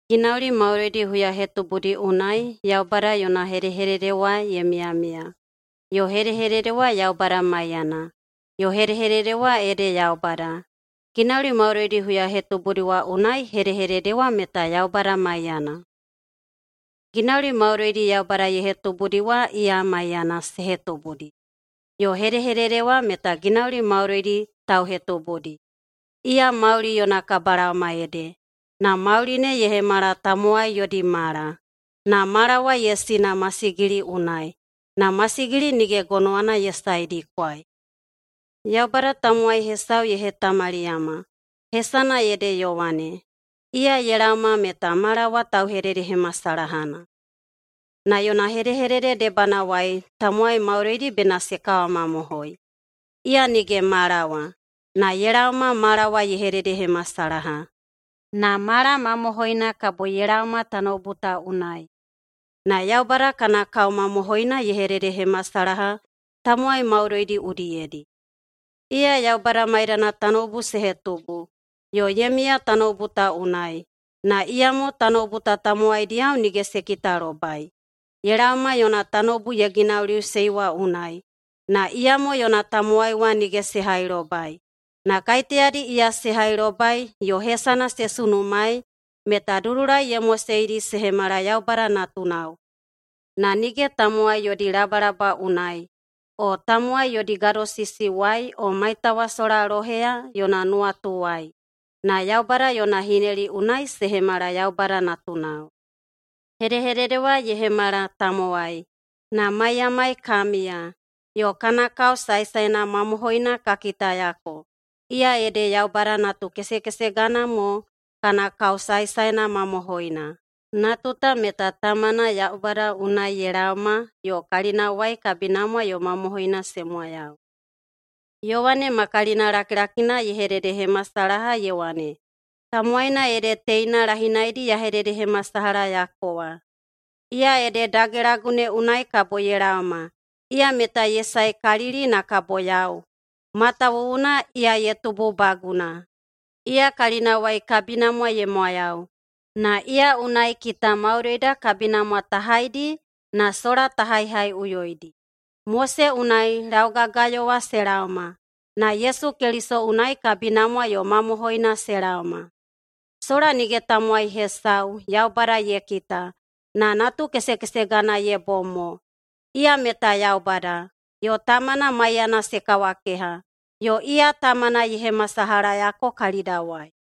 Ginauli maudoidi huyahetubudi unai Yaubada yona Hedehedede wa ye miyamiya, yo Hedehedede wa Yaubada maiyana, yo Hedehedede wa ede Yaubada. Ginauli maudoidi huyahetubudi wa unai Hedehedede wa meta Yaubada maiyana. Ginauli maudoidi Yaubada ye hetubudi wa iya maiyana se hetubudi, yo Hedehedede wa meta ginauli maudoidi tauhetubudi. Iya mauli yona kabalaoma ede, na mauli ne ye hemala tamowai yodi mala. Na mala wa ye sina masigili unai, na masigili nige gonowana ye saedikwai. Yaubada tamowai hesau ye hetamaliyama, hesana ede Yowane. Iya ye laoma meta mala wa tauhededehemasalahana. Na yona hedehedede debanawai tamowai maudoidi bena se kawamamohoi. Iya nige mala wa, na ye laoma mala wa ye hededehemasalaha. Na mala mamohoina kabo ye laoma tanoubu ta unai, na Yaubada kana kao mamohoina ye hededehemasalaha tamowai maudoidi udiyedi. Iya Yaubada maiyana tanoubu se hetubu, yo ye miya tanoubu ta unai, na iyamo tanoubu ta tamowaidiyao nige se kitalobai. Ye laoma yona tanoubu ye ginauliꞌusei wa unai, na iyamo yona tamowai wa nige se hailobai. Na kaiteyadi iya se hailobai yo hesana se sunumaei, meta dudulai ye moseidi se hemala Yaubada natunao. Na nige tamowai yodi labalaba unai, o tamowai yodi gadosisiwai o maitawasola loheya yona nuwatuwai, na Yaubada yona hineli unai se hemala Yaubada natunao. Hedehedede wa ye hemala tamowai, na maiyamai ka miya. Yo kana kao saesaena mamohoina ka kitayako, iya ede Yaubada natukesekesegana mo kana kao saesaena mamohoina. Natu ta meta Tamana Yaubada unai ye laoma yo kalinawai kabinamwa yo mamohoina se mwayau. Yowane ma kalina lakilakina ye hededehemasalaha ye wane, “Tamowaina ede teina lahinaidi ya hededehemasalahayako wa, ‘Iya ede dagelagu ne unai kabo ye laoma, iya meta ye saekalili na kabo yau, matawuwuna iya ye tububaguna.’” Iya kalinawai kabinamwa ye mwayau. Na iya unai kita maudoida kabinamwa ta haidi na sola ta haihaiꞌuyoidi. Mose unai laugagayo wa se laoma, na Yesu Keliso unai kabinamwa yo mamohoina se laoma. Sola nige tamowai hesau Yaubada ye kita, na natukesekesegana ye bom mo. Iya meta Yaubada, yo Tamana maiyana se kawakeha, yo iya Tamana ye hemasalahayako kalidawai.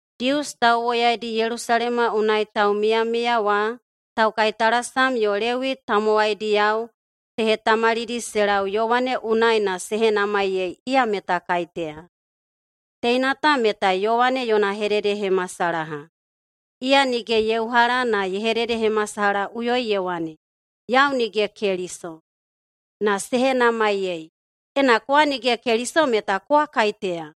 Dius tauwoyaidi Yelusalema unai taumiyamiya wa, taukaitalasam yo Lewi tamowaidiyao se hetamalidi se lau Yowane unai na se henamaiyei iya meta kaiteya. Teina ta meta Yowane yona hededehemasalaha. Iya nige ye uhala na ye hededehemasalahaꞌuyoi ye wane, “Yau nige Keliso.” Na se henamaiyei, “Ena kowa nige Keliso, meta kowa kaiteya?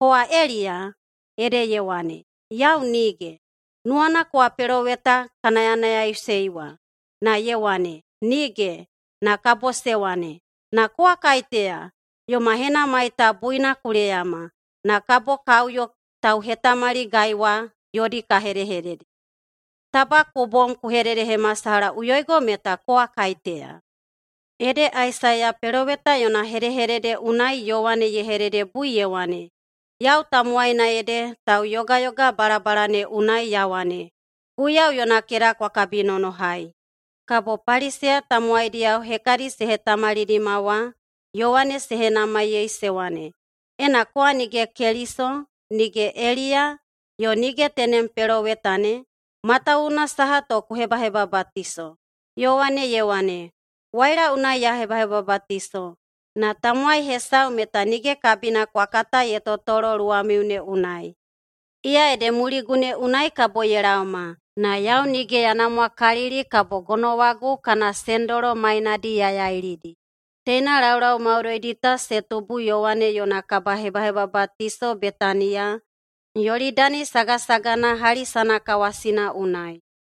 Kowa Eliya?” Ede ye wane, “Yau nige.” “Nuwana kowa peloweta ka nayanayaiꞌusei wa?” Na ye wane, “Nige.” Na kabo se wane, “Na kowa kaiteya? Yoma henamai ta buina ku leyama, na kabo ka uyo tauhetamaligai wa yodi ka hedehedede. Taba ku bom ku hededehemasalahaꞌuyoigo meta kowa kaiteya.” Ede Aisaiya peloweta yona hedehedede unai Yowane ye hededebui ye wane, “Yau tamowaina ede tauyogayoga balabala ne unai ya wane, ‘Guiyau yona keda kwa kabinonohai.’” Kabo Paliseya tamowaidiyao hekadi se hetamalidima wa Yowane se henamaiyei se wane, “Ena kowa nige Keliso, nige Eliya, yo nige tenem peloweta ne, matawuwuna saha to ku hebahebabatiso?” Yowane ye wane, “Waila unai ya hebahebabatiso. Na tamowai hesau meta nige kabina kwa kata ye totolo luwamiu ne unai. Iya ede muligu ne unai kabo ye laoma, na yau nige ya namwakalili kabo gonowagu kana sendolo mainadi ya yailidi.” Teina laulau maudoidi ta se tubu Yowane yona kabahebahebabatiso Betaniya, Yolidani sagasagana hali sanakawasina unai.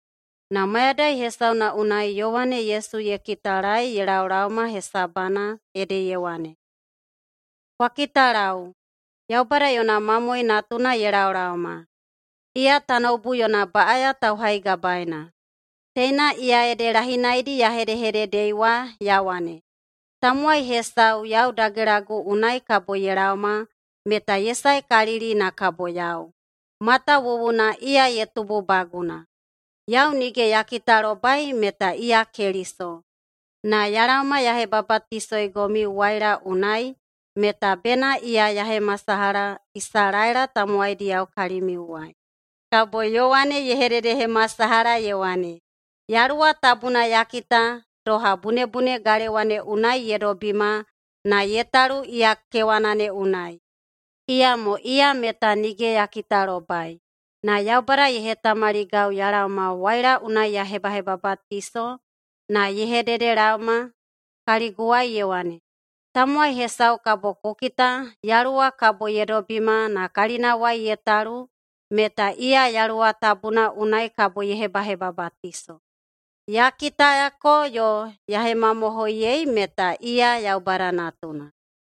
Na mayadai hesauna unai Yowane Yesu ye kitalaei ye laolaoma hesabana ede ye wane, “Kwa kitalau, Yaubada yona mamoe natuna ye laolaoma. Iya tanoubu yona baꞌaya tauhaigabaeina. Teina iya ede lahinaidi ya hedehededei wa ya wane, ‘Tamowai hesau yau dagelagu unai kabo ye laoma meta ye saekalili na kabo yau, matawuwuna iya ye tububaguna.’ Yau nige ya kitalobai meta iya Keliso. Na ya laoma ya hebabatisoigomiu waila unai meta bena iya ya hemasalaha Isalaela tamowaidiyao kalimiuwai.” Kabo Yowane ye hededehemasalaha ye wane, “Yaluwa Tabuna ya kita doha bunebune galewa ne unai ye dobima na ye talu iya kewana ne unai. Iyamo iya meta nige ya kitalobai, na Yaubada ye hetamaligau ya laoma waila unai ya hebahebabatiso na ye hededelaoma kaliguwai ye wane, ‘Tamowai hesau kabo ku kita Yaluwa kabo ye dobima na kalinawai ye talu meta iya Yaluwa Tabuna unai kabo ye hebahebabatiso.’ Ya kitayako yo ya hemamohoiyei meta iya Yaubada Natuna.”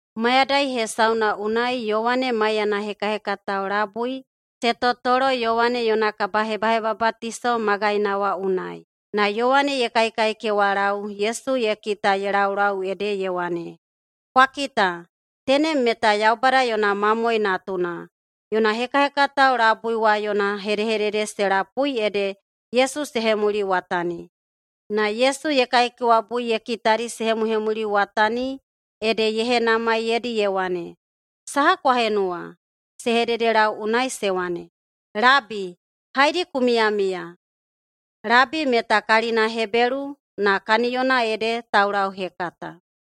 Mayadai hesauna unai Yowane maiyana hekahekatao labui se totolo Yowane yona kabahebahebabatiso magaina wa unai. Na Yowane ye kaikaikewalau Yesu ye kita ye laulau ede ye wane, “Kwa kita, tenem meta Yaubada yona mamoe natuna!” Yona hekahekatao labui wa yona hedehedede se lapui ede Yesu se hemuliwatani. Na Yesu ye kaikewabui ye kitadi se hemuhemuliwatani, ede ye henamaiyeidi ye wane, “Saha kwa henuwa?” Se hededelau unai se wane, “Labi, haedi ku miyamiya?” (Labi [meta kalina Hebelu na] kaniyona ede Taulauhekata.)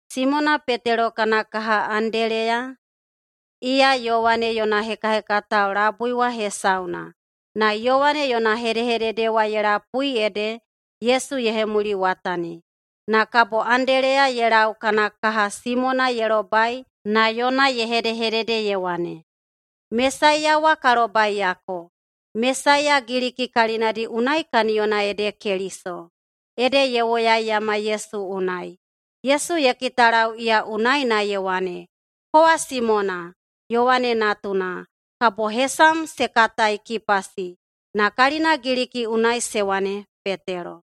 Simona Petelo kana kaha Andeleya, iya Yowane yona hekahekatao labui wa hesauna, na Yowane yona hedehedede wa ye lapui ede Yesu ye hemuliwatani. Na kabo Andeleya ye lau kana kaha Simona ye lobai na yona ye hedehedede ye wane, “Mesaiya wa ka lobaiyako.” (Mesaiya Giliki kalinadi unai kaniyona ede Keliso.) Ede ye woyaiyama Yesu unai. Yesu ye kitalau iya unai na ye wane, “Kowa Simona, Yowane natuna. Kabo hesam se katai Kipasi.” (Na kalina Giliki unai se wane Petelo.)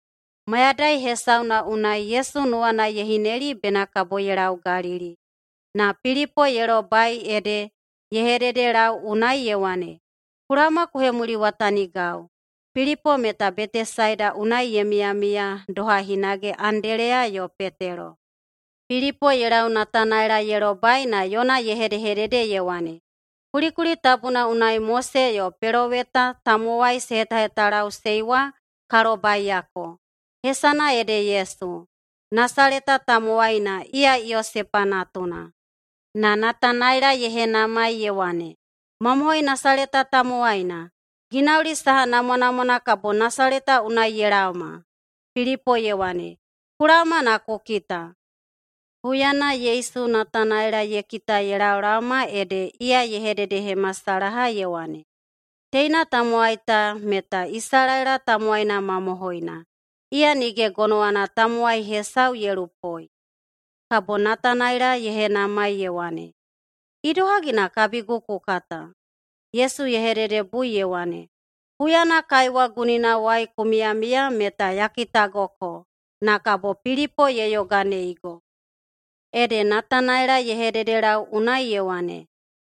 Mayadai hesauna unai Yesu nuwana ye hineli bena kabo ye lau Galili. Na Pilipo ye lobai ede ye hededelau unai ye wane, “Ku laoma ku hemuliwatanigau.” Pilipo meta Betesaida unai ye miyamiya doha hinage Andeleya yo Petelo. Pilipo ye lau Natanaela ye lobai na yona ye hedehedede ye wane, “Kulikuli tabuna unai Mose yo peloweta tamowai se hetahetalaꞌusei wa ka lobaiyako. Hesana ede Yesu, Nasaleta tamowaina, iya Yosepa natuna.” Na Natanaela ye henamai ye wane, “Mamohoi Nasaleta tamowaina? Ginauli saha namwanamwana kabo Nasaleta unai ye laoma?” Pilipo ye wane, “Ku laoma na ku kita.” Huyana Yesu Natanaela ye kita ye laolaoma ede iya ye hededehemasalaha ye wane, “Teina tamowai ta meta Isalaela tamowaina mamohoina, iya nige gonowana tamowai hesau ye lupoi.” Kabo Natanaela ye henamai ye wane, “Idohagi na kabigu ku kata?” Yesu ye hededebui ye wane, “Huyana kaiwa guninawai ku miyamiya meta ya kitagoko, na kabo Pilipo ye yoganeigo.” Ede Natanaela ye hededelau unai ye wane,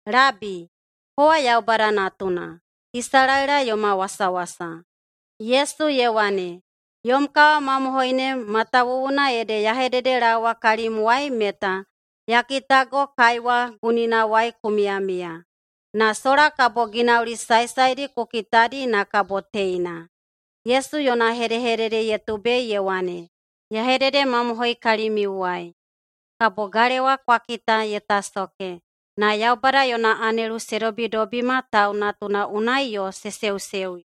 “Labi, kowa Yaubada Natuna, Isalaela yoma wasawasa.” Yesu ye wane, “Yom kawamamohoi ne matawuwuna ede ya hededelaowa kalimwai meta ya kitago kaiwa guninawai ku miyamiya. Na sola kabo ginauli saesaedi ku kitadi na kabo teina.” Yesu yona hedehedede ye tubei ye wane, “Ya hededemamohoi kalimiuwai: Kabo galewa kwa kita ye tasoke, na Yaubada yona anelu se dobidobima Tau Natuna unai yo se seuseuyo.”